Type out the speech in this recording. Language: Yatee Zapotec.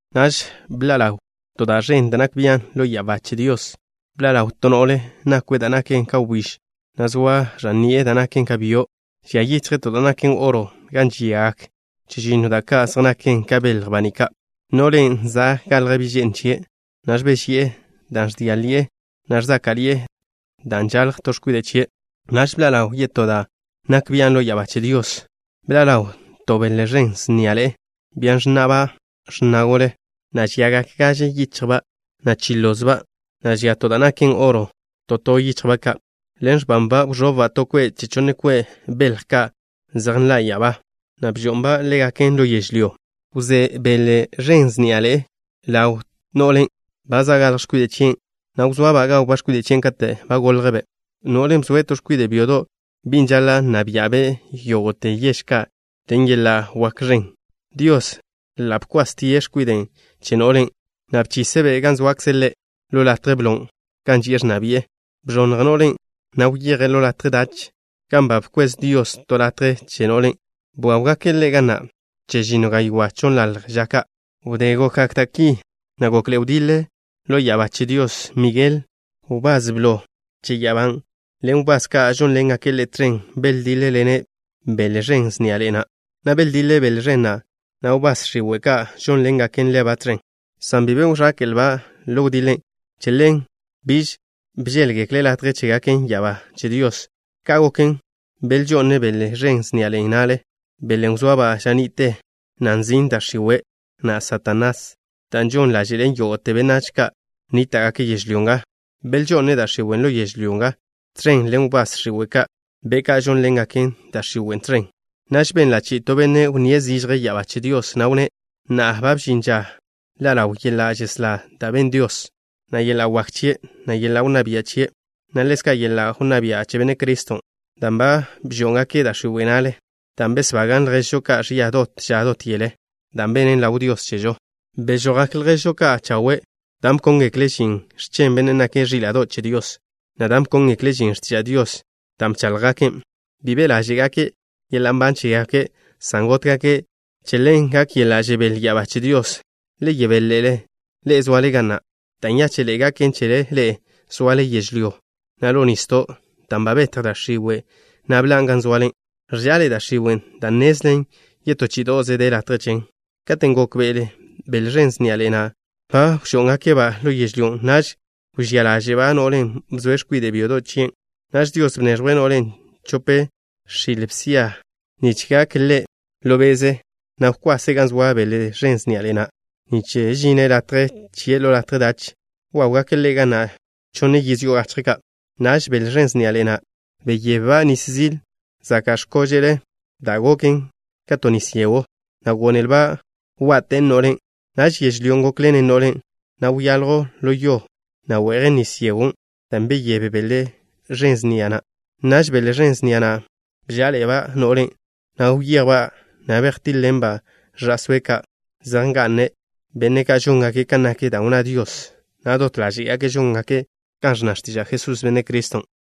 Naž bḻa' ḻaw to da' ẕen da' nak bian' ḻo ya'abá che Dios. Bḻa' ḻaw to no'le nakwe' da' naken ka wbíž, na' zoa ẕan ni'e da' naken ka byo'. Žia yichje' to da' naken oro gan žiagak chežinno da' ka' zej naken ka belj baní' ka'. No'len' za' galj bi' že'n chie', na' ẕbéžyi'e dan' ẕdia' ḻi'e, na' ẕzáka'ḻi'e dan' žalj to x̱kwide' chie'. Naž bḻa' ḻaw yetó da' nak bian' ḻo ya'abá che Dios. Bḻa' ḻaw to bele ẕen sniaḻe'e, bia ẕnna'ba' x̱na gole, na' žiagak gaže yichjba', na' chi lozba', na' žia to da' naken oro to to yichjba' ka'. Ḻen x̱banba' wẕobba' to kwe' che chonne kwe' belj ka' zej nḻa' ya'abá, na' bžo'nba' ḻégaken ḻo yežlyó. Wzé bele ẕen sniaḻe'e na' ḻaw no'len' ba žalj x̱kwide' chie', na' wzoaba' gawba' x̱kwide' chien' kate' ba naljbe'. No'len' bzoe' to X̱kwide' byodo', Bin' žaḻa' nna bia'be' yógo'te yež ka' ḻen yela' wak ẕen. Dios ḻa' bkwastie' X̱kwiden' che no'len', na' bchise'-be' gan zoakze' Ḻe', ḻo latje blon' gan ži'e ẕnna bi'e. Bẕonnj no'len', na' wyeje' ḻo latje dach, gan ba bkwez Dios to latje che no'len'. Wáwgake' ḻe' ga na' chežinno gaywá' chonnḻalj ža ka'. Wdé gokgak da' ki, na' gokḻe'e wdiḻe ḻo ya'abá che Dios. Migel, wbás blo che ya'abá ḻen wbás ka' žónḻengake' ḻe' tẕen, beldíḻ-ḻene' bele ẕen sniaḻe'e na', na' beldiḻe bele ẕen na', na' wbás x̱iwe' ka' žónḻengaken ḻeba' tẕen, san bi be wẕéke'lba' ḻo wdiḻen'. Che ḻen biž bžéḻgekle latje chégaken ya'abá che Dios. Ka' goken, belžo'ne' bele ẕen sniaḻe'e na' na'le, belen' wzoaba' ža ni'te, na' nzin' Da' X̱iwe', na' Satanás, dan' žon ḻáže'len yógo'te benách ka' nníta'gake' yežlyó nga. Belžo'ne' da' x̱iwe' ḻo yežlyó nga, tẕen ḻen wbás x̱iwe' ka', be' ka' žónḻengaken da' x̱iwen' tẕen. Naž benla' chi'i to benne' wnníe' zižje ya'abá che Dios, na' wnné': Na'a ba bžin ža ḻa' ḻaw yeḻa' žeslá da' ben Dios, na' yeḻa' wak chie', na' yeḻa' wnná bia' chie', na' ḻezka' yeḻa' wnná bia' che Benne' Criston', dan' ba bžó'ngake' da' x̱iwe' na'le, dan' besbagan' lježžo ka' ẕia dot ža dot yele, dan' benen ḻaw Dios chežo. Bežojgak lježžo ka' chawe', dan' bkóngekle' žin x̱chen Bennen' nake' Ẕíla'do' che Dios, na' dan' bkóngekle' žin x̱tiža' Dios da' bcháḻjgaken'. Bi be' ḻáže'gake' yeḻa' nban chégake', san gótgake'. Che ḻen gak yeḻa' žebél ya'abá che Dios. ¡Le yebél ḻe'e, zoale ga na'! Da' nyáche'ḻe'e gaken chele ḻe'e zoale yežlyó, na' ḻo nisdo', dan' ba betj da' x̱iwe', na' bḻan' gan zoale. Ẕža'ḻe'e da' x̱iwen' dan' nnezlen yetó chí'ido'ze de latje chen. Katen' gókbe'ele bele ẕen sniaḻe'e na' ba bžó'ngake'-ba' ḻo yežlyó, naž wžía ḻáže'ba' no'len' bzoe' X̱kwide' byodo' chien'. Naž Dios bneẕjwe' no'len' chope x̱il bsia ži'a nich gak ḻe' ḻo be'ze, na' wkwase' gan zoa bele ẕen sniaḻe'e na', nich žine' latje chie' ḻo latje dach. Wáwgake' ḻe' ga na' chonne yiz yo'o gachje ka'. Naž bele ẕen sniaḻe'e na' beyebba' nis zil zaka' x̱kóže'le', da' goken ka to nis yegw, na' gónelba' wa'ten no'len'. Naž yežlyó gókḻenen no'len', na' wyaljw ḻo yo, na' we'jen nis yegon' dan' beyéb bele ẕen sniaḻe'e na'. Naž bele ẕen sniaḻe'e na' bžá'aḻe'eba' no'len', na' wyejba', na' bejtíḻ-ḻenba' ẕa'sóe' ka' zej nga'ne', benne' ka' žóngake' kan nak da' wnná Dios, na' dot ḻáze'gake' žóngake' kan ẕnna x̱tiža' Jesús, Benne' Criston'.